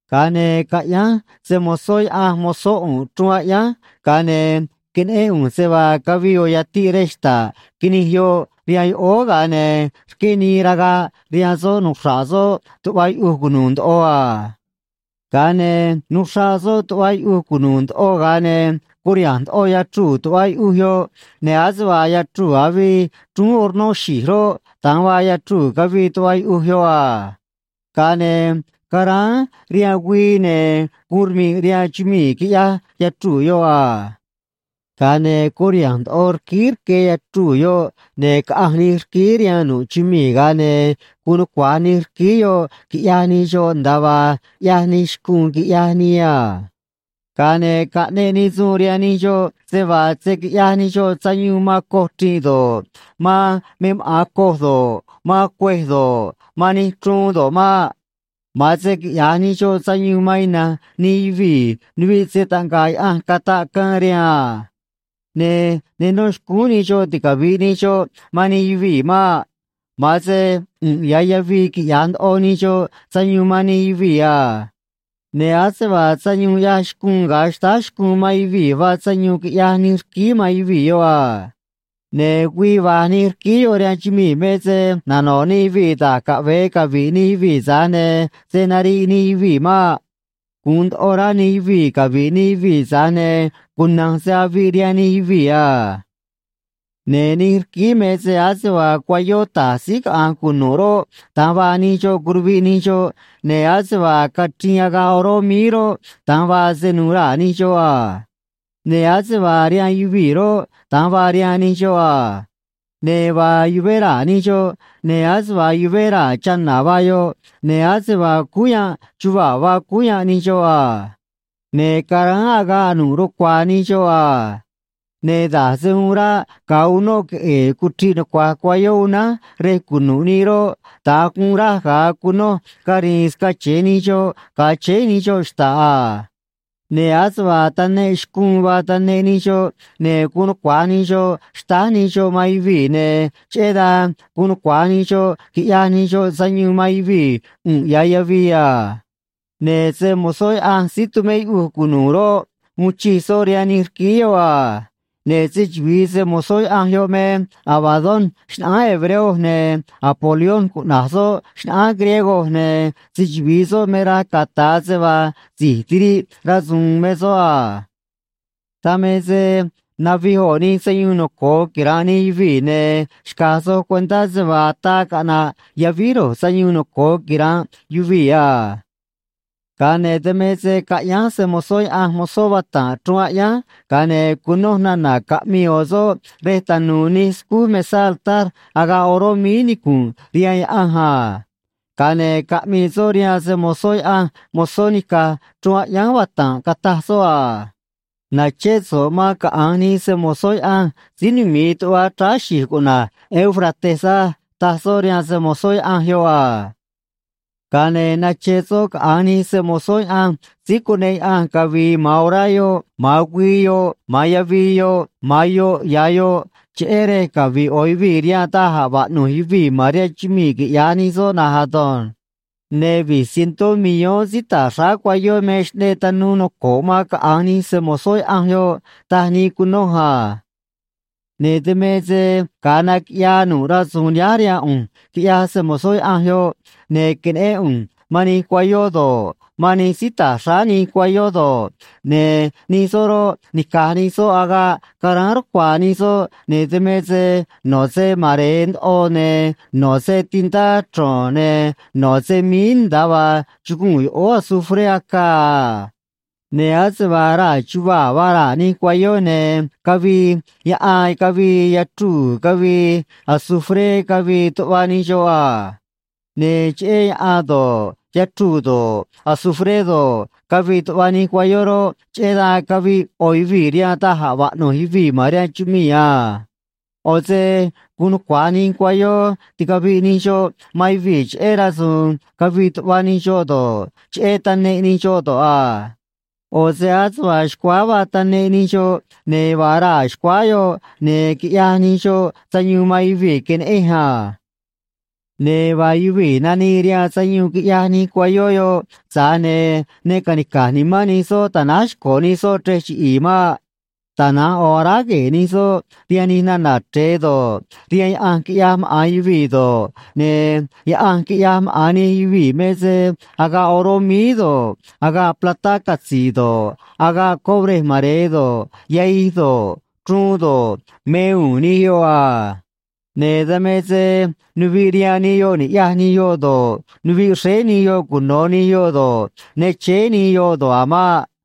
Ga̱a ne̱ caꞌyánj se‑mo̱zó Yaꞌanj mozó ꞌu̱nꞌ chruun aꞌyánj, ga̱a ne̱ queneꞌén ꞌu̱nj se vaa cavii ꞌo̱ yatiꞌ rej xta̱ꞌ quinij yoꞌ rihaan yoꞌóó, ga̱a ne̱ rqué nii ragaꞌ rihaan soꞌ nuxra̱ꞌ soꞌ tuꞌva yuꞌuj cunu̱u̱ ndoꞌo a. Ga̱a ne̱ nuxraꞌ soꞌ tuꞌva yuꞌuj cunu̱u̱ ndoꞌo, ga̱a ne̱ curiha̱nj ndoꞌo yachruu̱ tuꞌva yuꞌuj yoꞌ, ne̱ ase vaa yachruu̱ avii chrúún hornó xi̱j roꞌ, da̱nj vaa yachruu̱ cavii tuꞌva yuꞌuj yoꞌ a. Ga̱a ne̱ caráán rihaan güii, ne̱ guun rmi̱ꞌ rihaan chumii̱, quiꞌyaj yachruu̱ yoꞌ a. Ga̱a ne̱ curiha̱nj ndoꞌo rquíí rque yachruu̱ yoꞌ, ne̱ caꞌanj nij rquíí rihaan nu̱ꞌ chumii̱, ga̱a ne̱ guun nucua̱j nij rquíí yoꞌ quiꞌyaj nij xoꞌ nda̱a vaa ꞌyaj nij xcuun, quiꞌyaj nii a. Ga̱a ne̱ caꞌneꞌ nii suun rihaan nij xoꞌ se vaa se̱ quiꞌyaj nij xoꞌ sayuun man coj chri̱nꞌ do̱ꞌ, man me maꞌa̱n coj do̱ꞌ, man cuêj do̱ꞌ, man nij chruun do̱ꞌ maꞌ. Ma̱an se quiꞌya̱j nij xoꞌ sayuun man ina̱nj nij yuvii̱ nuviꞌ se‑taꞌnga̱ꞌ Yaꞌanj cataꞌ caan rihaan a. Ne̱ ne nó xcúún nij xoꞌ ticavi̱ꞌ nij xoꞌ man nij yuvii̱ maꞌ. Ma̱an se ꞌu̱nꞌ ya̱ yavii quiꞌyaj ndoꞌo nij xoꞌ sayuun man nij yuvii̱ a. Ne̱ ase vaa sayuun ꞌyaj xcuun ga̱a xtáj xcuun man yuvii̱ vaa sayuun quiꞌyaj nij rquíí man yuvii̱ yoꞌ a. Ne̱ güii va̱j nij rquíí yoꞌ rihaan chumii̱ me se nano̱ꞌ nij yuvii̱ da̱j caꞌve̱e cavi̱ꞌ nij yuvii̱, tza̱j ne̱ se̱ nariꞌ nij yuvii̱ maꞌ. Gu̱un ndoꞌo rá nij yuvii̱ cavi̱ꞌ nij yuvii̱, tza̱j ne̱ cuna̱nj se aviꞌ rihaan nij yuvii̱ a. Ne̱ nij rquíí me se ase vaa cuayó ta̱j síí caꞌa̱nj cunu̱ꞌ roꞌ, da̱nj vaa nij xoꞌ curuviꞌ nij xoꞌ, ne̱ ase vaa cachriin agaꞌ oró míí roꞌ, da̱nj vaa se nu̱u̱ raa̱ nij xoꞌ a. Ne̱ ase vaa rihaan yuvii̱ roꞌ, da̱nj vaa rihaan nij xoꞌ a. Ne̱ vaa yuvé raa̱ nij xoꞌ, ne̱ ase vaa yuvé raa̱ chana̱ vaa yoꞌ, ne̱ ase vaa cúú yanꞌ chuvaa̱ vaa cúú yanꞌ nij xoꞌ a. Ne̱ caráán agaꞌ nu̱ꞌ rucua̱a̱ nij xoꞌ a. Ne̱ da̱j se uun ráꞌ ga̱a unóꞌ queꞌe̱e̱ cuchriꞌ nucua̱j cuayó unánj rej cunu̱ꞌ nii roꞌ, da̱nj guun raj ga̱a cunoj cari̱i̱n scache̱e nij xoꞌ ga̱a chéé nij xoꞌ xta̱ꞌ a. Ne̱ ase vaa taneꞌ xcuun vaa taneꞌ nij xoꞌ, ne̱ guun nucua̱j nij xoꞌ xtáj nij xoꞌ man yuvii̱, ne̱ cheꞌé dan guun nucua̱j nij xoꞌ quiꞌyaj nij xoꞌ sayuun man yuvii̱ ꞌu̱nꞌ ya̱ yavii a. Ne̱ se‑mo̱zó Yaꞌanj síí tumé yuꞌuj cunu̱u̱ roꞌ, uun chij soꞌ rihaan nij rquíí yoꞌ a. Ne̱ se‑chuvi̱i se‑mo̱zó Yaꞌanj yoꞌ me Abadón xnaꞌánj hebreo, ne̱ Apolión cuꞌna̱j soꞌ xnaꞌánj griego, ne̱ se‑chuvi̱i soꞌ me raj cata̱a se vaa si̱j tiriꞌ rasu̱u̱n me soꞌ a. Dan me se navij ꞌo̱ nij sayuun noco̱o quira̱nꞌ nij yuvii̱, ne̱ xca̱j soj cuentá se vaa ataa caꞌna̱ꞌ yavíj ro̱j sayuun noco̱o quira̱nꞌ yuvii̱ a. Ga̱a ne̱ dan me se caꞌyánj se‑mo̱zó Yaꞌanj mozó vata̱nꞌ chruun aꞌyánj, ga̱a ne̱ cunoj nana̱ caꞌmii ꞌo̱ soꞌ rej tanu̱u̱ nij scúú mesá altar agaꞌ oró míí nicu̱nꞌ rihaan Yaꞌanj a. Ga̱a ne̱ caꞌmii soꞌ rihaan se‑mo̱zó Yaꞌanj mozó nica̱j chruun aꞌyánj vata̱nꞌ, cataj soꞌ a: ―Na̱ché so̱ꞌ man caꞌa̱nj nij se‑mo̱zó Yaꞌanj síí numi̱i tuꞌva chráá xi̱j cuꞌna̱j Éufrates á ―taj soꞌ rihaan se‑mo̱zó Yaꞌanj yoꞌ a. Ga̱a ne̱ nache soꞌ caꞌa̱nj nij se‑mo̱zó Yaꞌanj síí cuneꞌ Yaꞌanj cavi̱i̱ ma̱an orá yoꞌ, ma̱an güii yoꞌ, ma̱an yavii yoꞌ, ma̱an yoꞌ ya̱ yoꞌ, cheꞌé rej cavi̱ꞌ ꞌo̱ yuvii̱ rihaan da̱j a̱ vaꞌnu̱j yuvii̱ ma̱n rihaan chumii̱, quiꞌya̱j nij soꞌ na̱nj ado̱nj. Ne̱ vi̱j cientó millón síí ta̱j xráá cuayó me xꞌneꞌ tanuu noco̱ꞌ man caꞌa̱nj nij se‑mo̱zó Yaꞌanj yoꞌ, taj nii cunoj a. Ne̱ dan me se ga̱a naquiꞌyaa nu̱ꞌ rasu̱u̱n nihánj rihaan ꞌu̱nj, quiꞌyaj se‑mo̱zó Yaꞌanj yoꞌ, ne̱ queneꞌén ꞌu̱nj man nij cuayó do̱ꞌ, man nij síí ta̱j xráá nij cuayó do̱ꞌ, ne̱ nij soꞌ roꞌ, nica̱j nij soꞌ agaꞌ caráán rucua̱a̱ nij soꞌ, ne̱ dan me se no̱ se mare̱e ndoꞌo, ne̱ no̱ se tintá chro̱n, ne̱ no̱ se míí, nda̱a vaa chuguu̱n yoꞌóó azufré acaa a. Ne̱ ase vaa raa̱ chuvaa̱ vaa raa̱ nij cuayó, ne̱ cavii yaꞌan cavii yachruu̱ cavii azufré cavii tuꞌva nij xoꞌ a. Ne̱ cheꞌé yaꞌan do̱ꞌ, yachruu̱ do̱ꞌ, azufré do̱ꞌ, cavii tuꞌva nij cuayó roꞌ, cheꞌé dan caviꞌ ꞌo̱ yuvii̱ rihaan da̱j a̱ vaꞌnu̱j yuvii̱ ma̱n rihaan chumii̱ a. ꞌO̱ se guun nucua̱j nij cuayó ticaviꞌ nij xoꞌ man yuvii̱ cheꞌé rasu̱u̱n cavii tuꞌva nij xoꞌ do̱ꞌ, cheꞌé taneꞌ nij xoꞌ do̱ꞌ a. ꞌO̱ se ase vaa xcuáá vaa taneꞌ nij xoꞌ, ne̱ vaa raa̱ xcuáá yoꞌ, ne̱ quiꞌyaj nij xoꞌ sayuun man yuvii̱, queneꞌenj a. Ne̱ vaa yuvii̱ nanii rihaan sayuun quiꞌyaj nij cuayó yoꞌ, tza̱j ne̱ ne ca̱nica̱j nimán nij soꞌ ta̱náj xco̱ nij soꞌ chrej chiꞌi̱i̱ maꞌ. Tana̱nj ꞌo̱ aráj gue̱e̱ nij soꞌ rihaan nij nana̱ chre̱e do̱ꞌ, rihaan yaꞌanj quiꞌyaj maꞌa̱n yuvii̱ do̱ꞌ, ne̱ yaꞌanj quiꞌyaj maꞌa̱n nij yuvii̱ me se agaꞌ oró míí do̱ꞌ, agaꞌ platá catzi̱i̱ do̱ꞌ, agaꞌ cobré mare̱e do̱ꞌ, yahij do̱ꞌ, chruun do̱ꞌ, me u̱u̱n nij yoꞌ a. Ne̱ dan me se nuviꞌ rihaan nij yoꞌ ni̱ꞌyaj nij yoꞌ do̱ꞌ, nuviꞌ xréé nij yoꞌ cuno̱ nij yoꞌ do̱ꞌ, ne chéé nij yoꞌ do̱ꞌ a̱ maꞌ.